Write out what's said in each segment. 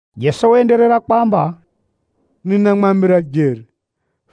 Jeso waenderera kwamba, “Ninamwambira jeri,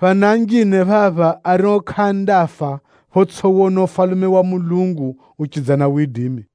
phana anjine phapha ario kʼaandafa photsʼiwona Ufalume wa Mulungu uchidza na widimi.”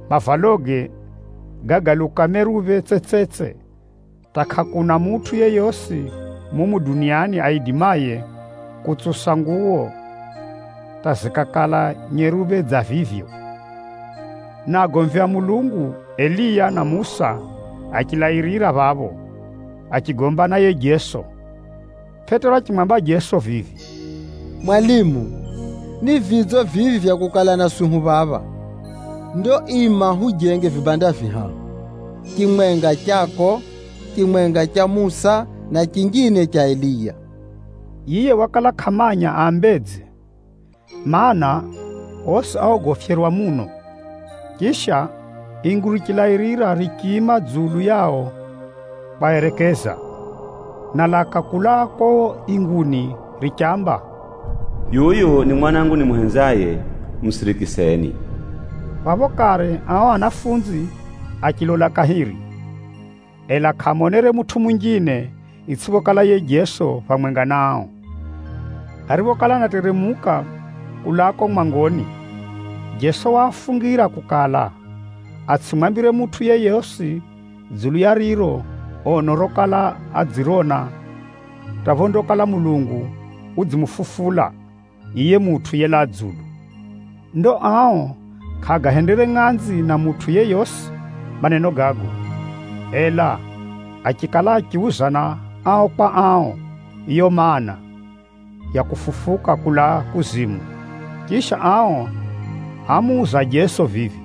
Mavaloge gágaluka meruphe tsetsetse hata kʼakuna mutʼu yeyosi mumu duniani aidimaye kutsusa nguwo hata zikakala nyeruphe dza vivyo. Na agomvi a Mulungu Eliya na Musa achilairira phapho, achigomba na yiye Jeso. Pʼetero achimwamba Jeso vivi, “Mwalimu, ni vidzo vivi vya kukala naswi hu phamwenga phapha. Ndo ima hujenge vibanda vihahu: chimwenga chako, chimwenga cha Musa na chinjine cha Eliya.” Yiye wakala kʼamanya aambedze, mana, osi áogofyerwa muno. Chisha, ingu richilairira richiima dzulu yao kwaerekeza, na laka kulaa kuko inguni richamba, “Yuyu ni Mwanangu nimuhenzaye, musirikiseni.” Phapho kare ao anafunzi achilola kahiri, ela kʼaamonere mutʼu munjine, itsʼiphokala yiye Jeso, phamwenga na ao. Ariphokala anateremuka kulaa kuko mwangoni, Jeso waafungira kukala, atsʼimwambire mutʼu yeyosi dzulu ya riro ono rokala adzirona hata phondakala Mulungu udzimufufula, yiye Mutʼu yelaa dzulu. Ndo ao kʼaagahendere ngʼanzi na mutʼu yeyosi maneno gago, ela achikala achiuzana ao kwa ao, yiyo maana, ya kufufuka kulaa kuzimu. Chisha ao ámuuza Jeso vivi,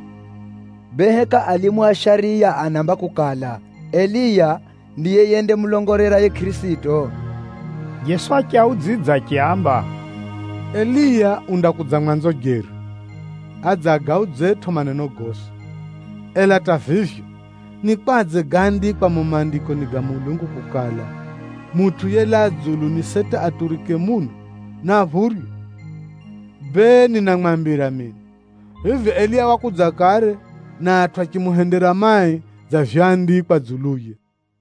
“Bee, heka alimu a shariya anaamba kukala, Eliya ndiye yendamulongolera yiye Kʼirisito?” Jeso achiaudzidza achiaamba, “Eliya undakudza mwanzo jeri, adze agaudzetʼo maneno gosi. Ela hata vivyo, ni kwadze gáandikwa mumo Maandikoni ga Mulungu kukala, Mutʼu yelaa dzulu ni seti aturike muno, na aphurywe? Bee ninamwambira mino, vivi Eliya wakudza kare, na atʼu achimuhendera mai dza vyoandikwa dzuluye.”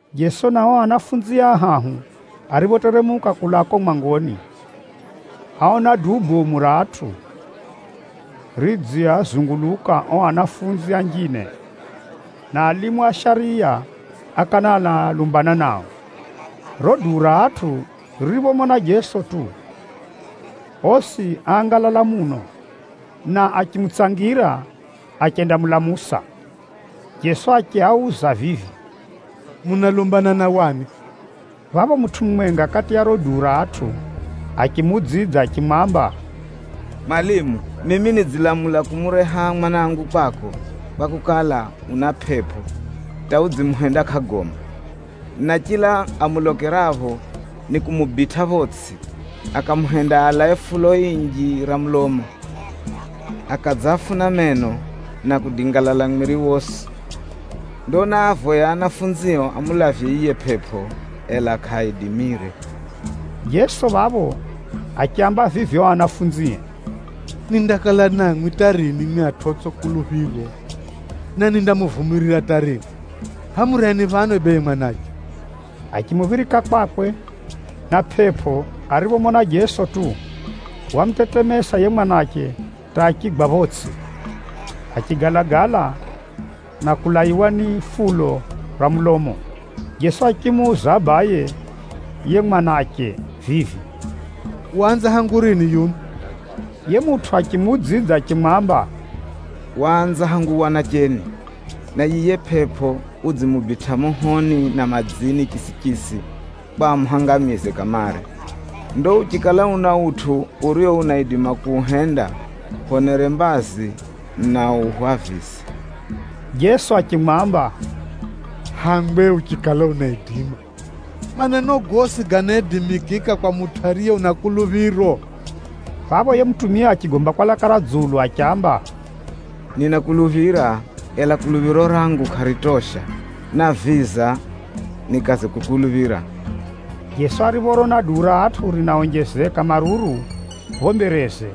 Jeso na ao anafunzie ahahu ariphoteremuka kulaa kuko mwangoni, áona duu bomu ra atʼu ridziazunguluka ao anafunzi anjine, na alimu a shariya ákala analumbana nao. Riro duu ra atʼu ririphomona Jeso tu, osi áangalala muno, na achimutsangira achendamulamusa. Jeso achiuza vivi, “Munalumbana na wani?” Phapho mutʼu mumwenga kati ya riro duu ra atʼu achimuudzidza achimwamba, “Mwalimu, mimi nidzilamula kumureha mwanangu kwako, kwakukala, una pʼepʼo hata udzimuhenda kʼagomba. Na chila amulokerapho, nikumubitʼa photsʼi, akamuhenda alae fulo inji ra mulomo, akadzafuna meno, na kudingalala mwiri wosi. Ndo náavoya ahumwao amulavye yiye pʼepʼo, ela kʼaaidimire.” Jeso phapho achiaamba vivi ao ahumwae, “Nindakala Na mwimwi hata rini mwimwi atʼu otsʼi kuluphiro? Na nindamuvumirira hata rini? Hʼaya mureheni phano bee yiye mwanache.” Achimuphirika kwakwe, na pʼepʼo ariphomona Jeso tu, wamutetemesa yiye mwanache hata achigwa photsʼi, achigalagala na kulaiwa ni fulo ra mulomo. Jeso achimuuza abaye yiye mwanache vivi, “Waanza hangu rini yuno?” Yiye mutʼu achimuudzidza achimwamba, “Waanza hangu wanacheni. Na yiye pʼepʼo udzimubitʼa mohoni na madzini chisichisi kwa amuhangamize kamare. Ndo uchikala una utʼu urio unaidima kuuhenda, hwonere mbazi na uhwavize!” Jeso achimwamba, “Hangwe, uchikala unaidima! Maneno gosi ganaidimikika kwa mutʼu ariye una kuluphiro.” Phapho yiye mutumia achigomba kwa laka ra dzulu achiamba, “Ninakuluphira, ela kuluphiro rangu kʼaritosha, naviza nikaze kukuluphira.” Jeso ariphorona duu ra atʼu rinaonjezeka maruru phapho mbereze,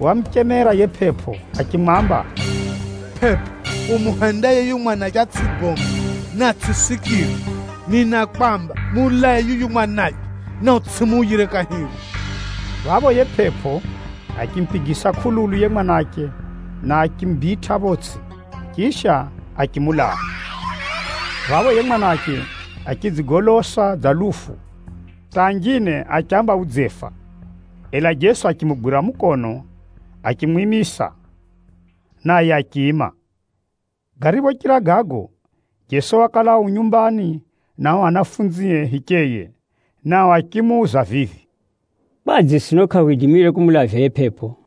wamuchemera yiye pʼepʼo achimwamba, “Pʼepʼo umuhendaye yuyu mwanache atsʼigombe na atsʼisikire, ninakwamba, mulae yuyu mwanache, na utsʼimuuyire kahiri.” Phapho yiye pʼepʼo, achimupigisa kʼululu yiye mwanache na achimubitʼa photsʼi, chisha achimulaa. Phapho yiye mwanache achidzigolosa dza lufu, hata anjine achiamba udzefa. Ela Jeso achimugwira mukono achimwimisa, naye achiima. Gariphochira gago, Jeso wakala u nyumbani na ao ahumwae hicheye, nao achimuuza vivi, “Kwadze sino kʼahwidimire kumulavya yiye pʼepʼo?”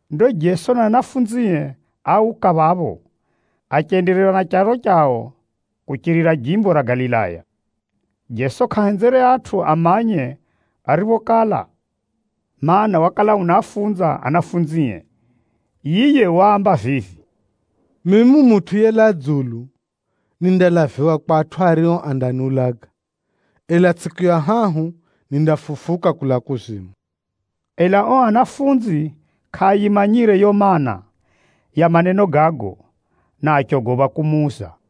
Ndo Jeso na ahumwae áuka phapho, achenderera na charo chao kuchirira jimbo ra Galilaya. Jeso kʼahenzere atʼu amanye ariphokala, mana, wakala unaafunza ahumwae. Yiye waamba vivi, “Mimi Mutʼu yelaa dzulu, nindalaviwa kwa atʼu ario andaniulaga, ela tsʼiku ya hahu nindafufuka kulaa kuzimu.” Ela ao ahumwa kʼaayimanyire yiyo maana ya maneno gago, na achogopha kumuuza.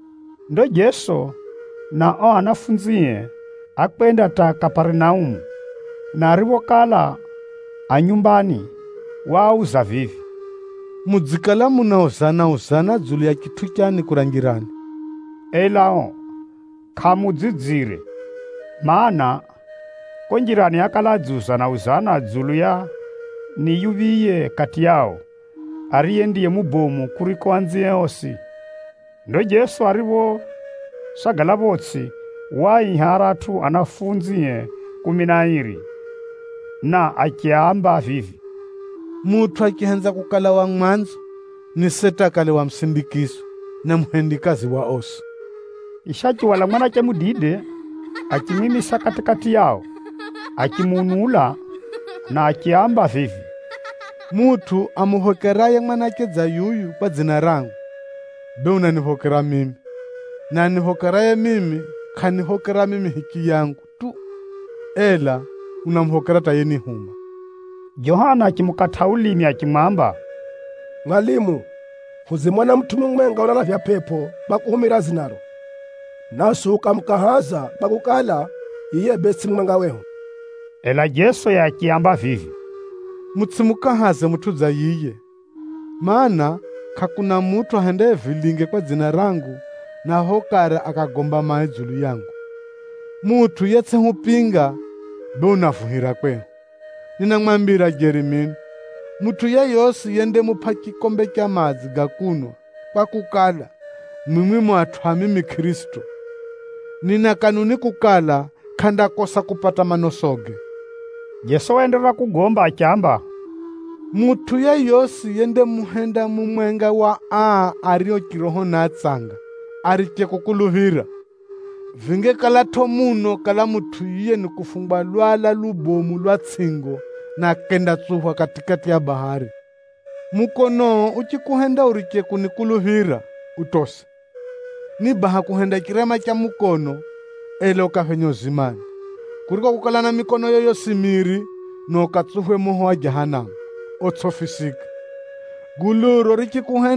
Ndo Jeso na ao ahumwae ákwenda hata Kaparinaumu, na ariphokala a nyumbani, waauza vivi, “Mudzikala munauzana-uzana dzulu ya chitʼu chani kura njirani?” Ela ao kʼaamuudzidzire, mana, kuko njirani ákala adziuzana-uzana dzulu ya ni yuphiye kati yao, ariye ndiye mubomu kuriko anzie osi. Ndo Jeso ariphosagala photsʼi, waaiha aratʼu ahumwae kumi na airi, na achiaamba vivi, “Mutʼu achihenza kukala wa mwanzo, ni seti akale wa musindikizo, na muhendikazi wa osi.” Chisha achihwala mwanache mudide, achimwimisa kati-kati yao. Achimuunula, na achiaamba vivi, “Mutʼu amuphokeraye mwanache dza yuyu kwa dzina rangu, bee unaniphokera mimi, na aniphokeraye mimi kʼaniphokera mimi hichiyangu tu, ela unamuphokera hata yenihuma.” Johana achimukatʼa ulimi achimwamba, “Mwalimu, hudzimona mutʼu mumwenga unalavya pʼepʼo kwa kuhumira dzinaro, naswi hukamukahaza, kwakukala, yiye bee tsʼiye mumwenga wehu.” Ela Jeso yiye achiaamba vivi, “Mutsʼimukahaze mutʼu dza yiye, mana, kʼakuna mutʼu ahendaye vilinge kwa dzina rangu, na phapho kare akagomba mai dzulu yangu. Mutʼu yetsʼihupinga, bee unavuhira kwehu. Ninamwambira jeri mino, mutʼu yeyosi yendamupʼa chikombe cha madzi ga kunwa kwakukala, mwimwi mu atʼu a mimi Kʼirisito, nina kanuni kukala, kʼandakosa kupata manosoge.” Jeso waenderera kugomba achiamba, “Mutʼu yeyosi yendamuhenda mumwenga wa aa ario chiroho ni atsanga ariche kukuluphira, vingekalatʼo muno kala mutʼu yiye ni kufungwa lwala lubomu lwa tsʼingo, na akendatsuphwa kati-kati ya bahari. Mukonoo uchikuhenda uriche kunituwa, utose. Ni baha kuhenda chirema cha mukono, ela ukaphenye uzimani, kuriko kukala na mikonoyo yosi miri, na ukatsuphwe moho wa Jahanamu otsʼifisika. Nakala zinjine zinaonjeza fungu ra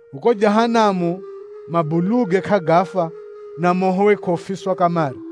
Kuko Jahanamu mabuluge kʼagafa, na mohowe kʼaufiswa kamare.